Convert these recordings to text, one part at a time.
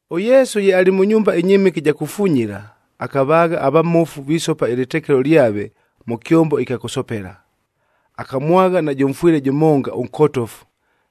ɄYesu ye alɨ mʉ nyumba ɨnyɨmɨke ɨja kufunyila, akavaagha avamofu visopa ɨlɨtekelo lyave mʉ kyombo ɨkya kʉsopela. Akamwagha najʉ mfwɨle jʉmonga ʉnkotofu,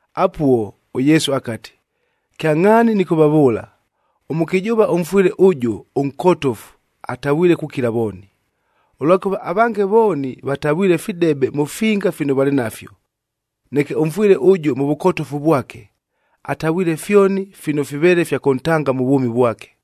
Apuo, ʉYesu akati, “Kyangʼhaani nɨkʉvavʉʉla, ʉmʉkɨjʉʉva ʉmfwɨle ʉjʉ ʉnkotofu atavwile kukila vooni. Ʉlwakʉva avange vooni, vatavwile fidebe mʉ finga fino valɨ nafyo. Neke ʉmfwɨle ʉjʉ mʉ vʉkotofu vwake, atavwile fyoni fino fiveele fya kʉntanga mʉ vwʉmi vwake!”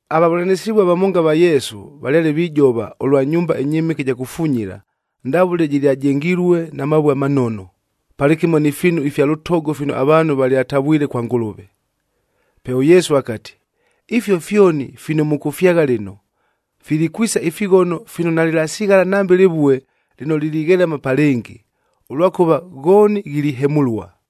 Avavʉlanɨsɨvua vamonga ava Yesu, valyale vijova ʉlwa nyumba ɨnyɨmɨke ɨja kufunyila, ndavʉle jɨlyajengilue na mavue amanono, palɨkɨmo ni fiinu ifya lʉtogo fino avaanhu valyatavwile kwa Ngʉlʉve. Pe ʉYesu akati, “Ifio fyoni fino mʉkʉfyagha lɨno, filikwisa ifighono fino nalɨlasighala nambe lɨvue lɨno lilighelama pa lɨngɨ, ʉlwakʉva ghooni ghilihemʉlua!”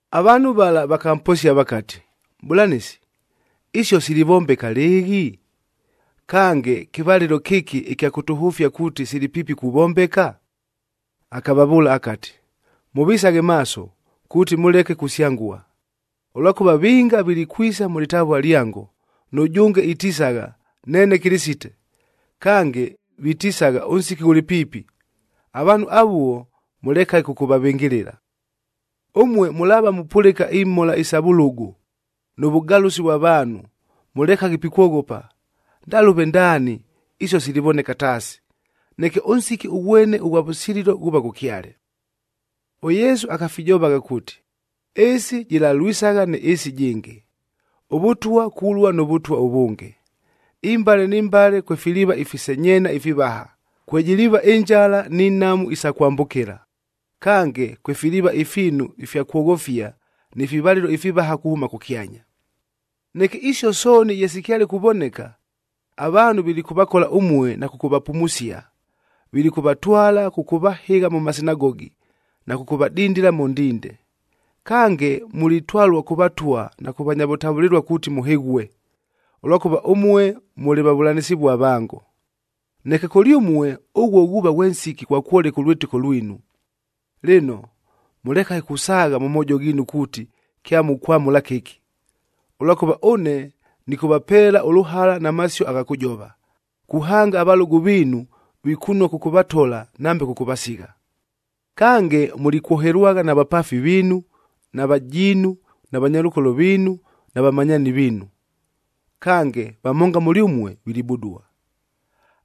Avaanhu vala vakamposia vakati, “Mʼbʉlanɨsi, isio silivombeka lɨɨghi? Kange, kɨvalɨlo kɨki ɨkya kʉtʉhʉfia kuuti sili piipi kuvombeka?” Akavavʉʉla akati, “Mʉvisaghe maaso, kuuti mʉleke kusyangua! Ʉlwakʉva vinga vilikwisagha mʉ lɨtavua lyango, nʉjʉnge itisagha, ‘Neene Kɨlɨsite!’ Kange, vitisagha, ‘Ʉnsiki ghʉlɨ piipi!’ Avaanhu avuo, mʉlekaghe kʉkʉvavɨngɨlɨla! Ʉmue mʉlaava mupʉlɨka imhola isa vʉlʉgʉ, nʉ vʉgalʉsi vwa vaanhu, mʉlekaghe pikwoghopa. Ndalʉve ndaani isio silivoneka taasi, neke ʉnsiki ʉghwene ʉghwa vʉsililo ghuuva ghʉkyale.” ɄYesu akafijovagha kuuti, “Ɨɨsi jɨlalwisagha nɨ ɨɨsi ɨjɨngɨ, ʉvʉtwa kulua nʉ vʉtwa ʉvʉnge. Imbale ni mbale kwefiliiva ifisenyeena ifivaha, kwejiliiva ɨnjala ni nhamu isa kwambʉkɨla. Kange, kwefiliiva ifiinu ifya kwoghofia ni fivalɨlo ifivaha kuhʉma kʉkyanya. “Neke, isio sooni ye sikyale kuvoneka, avaanhu vilikʉvakola ʉmue na kʉkʉvapumusia. Vilikʉvatwala kʉkʉvahɨgha mʉ masinagogi, na kʉkʉvadindila mʉ ndinde. Kange, mulitwalua kʉ vatwa na kʉ vanya vʉtavʉlɨlua kuuti mʉhɨghue, ʉlwakʉva ʉmue mʉlɨ vavʉlanɨsɨvua vango. Neke kʉlyʉmue, ʉghuo ghuuva ghwe nsiki ghwa kwoleka ʉlwɨtɨko lwinu. Lɨno, mʉlekaghe kusaagha mʉ moojo ghiinu kuuti kyamukwamʉla kɨki. Ʉlwakʉva ʉne nɨkʉvapeela ʉlʉhala na masio agha kʉjova, kuhanga avalʉgʉ viinu vikunua kʉkʉvatola nambe kʉkʉvasigha. “Kange, mulikwohelwagha na vapaafi viinu, na vajiinu, na vanyalʉkolo viinu, nava vamanyaani viinu. Kange vamonga mʉlyʉmue vilibudua.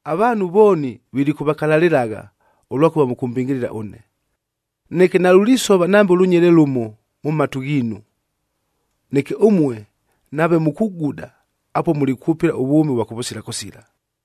Avaanhu vooni vilikʉvakalalɨlagha, ʉlwakʉva mʉkʉmbɨngɨlɨla ʉne. Neke nalulisova nambe lʉnyele lʉmo, mʉ matu ghiinu! Neke ʉmue nave mukuguda, apuo mulikwʉpɨla ʉvwʉmi ʉvwa kʉvʉsila kʉsila.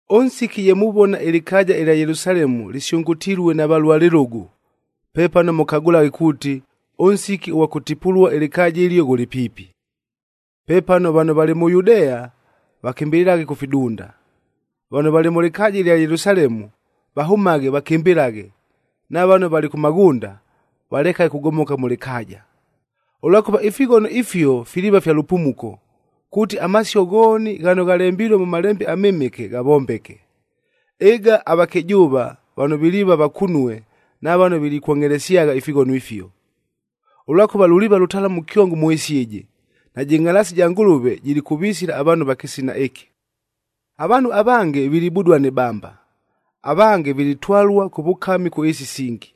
“Ʉnsiki ye muvona ɨlɨkaaja ɨlya Yelusalemu lɨsyʉngʉtilue na valua lɨlʉgʉ, pepano mʉkagʉlaghe kuuti, ʉnsiki ʉghwa kʉtipulua ɨlɨkaaja ɨlio ghʉlɨ piipi. Pepano vano valɨ mʉ Yudea, vakɨmbɨlɨlaghe kʉ fidunda. Vano valɨ mʉ lɨkaaja ɨlya Yelusalemu, vahʉmaghe vakɨmbɨlaghe, na vano valɨ kʉ maghʉnda, valekaghe kugomoka mʉ lɨkaaja. Ʉlwakʉva, ifighono ifio filiiva fya lʉpumuko, kuuti amasio ghooni ghano ghalembilue mʉ Malembe aMɨmɨke ghavombeke. Ɨga avakɨjʉʉva vano viliiva vakunue na vano vilikwongʼhelesyagha ifighono ifio! Ʉlwakʉva luliiva lʉtalamu kyongo mʉ ɨɨsi ɨjɨ, najɨ ngʼhalaasi ja Ngʉlʉve jilikʉvisila avaanhu ava kɨsina ɨkɨ. Avaanhu avange, vilibudua ni bamba, avange vilitwalua kʉ vʉkami kʉ ɨɨsi isingi.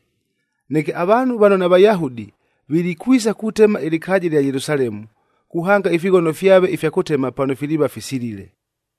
Neke avaanhu vano naVayahudi, vilikwisa kutema ɨlɨkaaja ɨlya Yelusalemu, kuhanga ifighono fyave ifya kʉtema pano filiiva fisilile.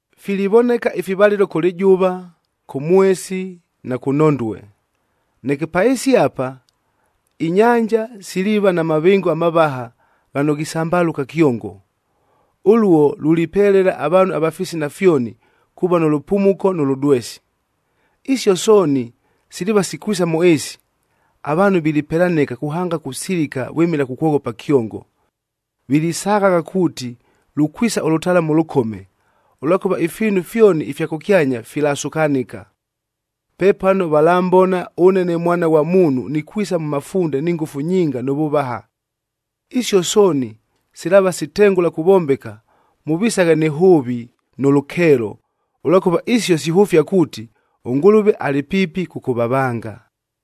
“Filivoneka ifivalɨlo kʉ lɨjʉva, kʉ mwesi na kʉ nhondue. Neke pa ɨɨsi apa, inyanja siliiva na mavɨngo amavaha ghano ghisambalʉka kyongo. Ʉluo lulipelela avaanhu ava fisina fyoni, kuuva nʉ lʉpumuko nʉ lʉdwesi. Isio sooni, siliiva sikwisa mʉ ɨɨsi, avaanhu vilipelanɨka kuhanga kusilika vwɨmɨla kukwoghopa kyongo. Vilisaghagha kuuti lukwisa ʉlʉtalamu ʉlʉkome, ʉlwakʉva ifiinu fyoni ifya kʉkyanya filasukanɨka. “Pepano valambona ʉne ne Mwana ghwa Muunhu nikwisa mʉ mafunde ni ngʉfu nyinga nʉ vʉvaha. Isio sooni, silaava sitengʉla kuvombeka, mʉvisaghe nɨ hʉʉvi nʉ lʉkeelo, ʉlwakʉva isio sihʉfia kuuti, ʉNgʉlʉve alɨ piipi kʉkʉvavanga!”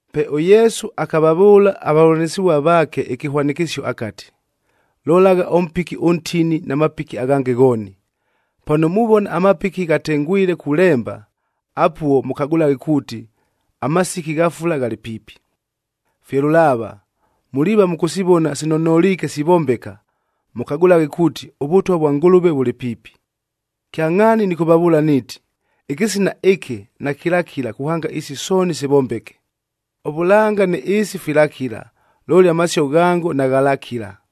Pe ʉYesu akavavʉʉla avavʉlanɨsɨvua vaake ɨkɨhwanɨkɨsio akati, “Lolagha ʉmpiki ʉntini na mapiki aghange ghooni. Pano muvona amapiki ghatengwile kulemba, apuo mʉkagʉlaghe kuuti, amasiki gha fula ghalɨ piipi. “Fye lʉlaava, muliiva mʉkʉsivona sino noliike sivombeka, mʉkagʉlaghe kuuti, ʉVʉtwa vwa Ngʉlʉve vʉlɨ piipi. Kyangʼhaani nɨkʉvavʉʉla niiti, ɨkɨsina ɨkɨ nakɨlakila kuhanga isi sooni sivombeke. Ʉvʉlanga nɨ ɨɨsi filakila, looli amasio ghango naghalakila.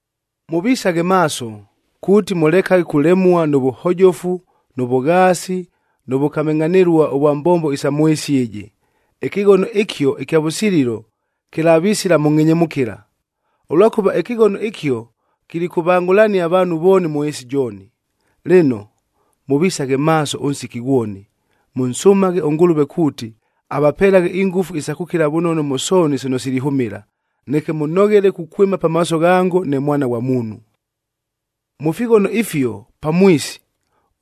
“Mʉvisaghe maaso, kuuti mʉlekaghe kulemua nʉ vʉhojofu, nʉ vʉghaasi, nʉ vʉkamɨngʼhanɨlua ʉvwa mbombo isa mʉ ɨɨsi ɨjɨ, ɨkɨghono ɨkio ɨkya vʉsililo kɨlavisila mʉ ngʼhenyemʉkɨla. Ʉlwakʉva ɨkɨghono ɨkio kilikʉvangʼhʉlania avaanhu vooni mʉ ɨɨsi jooni. Lɨno, mʉvisaghe maaso ʉnsiki ghwoni, mʉnsʉmaghe ʉNgʉlʉve kuuti, avapelaghe ingʉfu isa kʉkila vʉnono mʉ sooni sino silihʉmɨla, neke mʉnoghele kukwɨma pamaaso ghango ne Mwana ghwa Muunhu.” Mʉ fighono ifio pamwisi,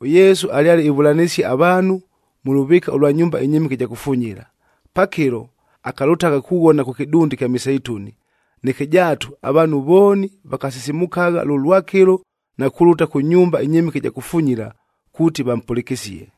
ʉYesu alyale ivʉlanɨsia avaanhu mʉ lʉvɨɨka ʉlwa nyumba ɨnyɨmɨke ɨja kufunyila. Pakɨlo, akalʉtagha kughona kʉ kɨdunda ɨkya Miseituni. Neke jaatu, avaanhu vooni vakasisimukagha lʉlwakɨlo na kulʉta kʉ nyumba ɨnyɨmɨke ɨja kufunyila, kuuti vampʉlɨkɨsie.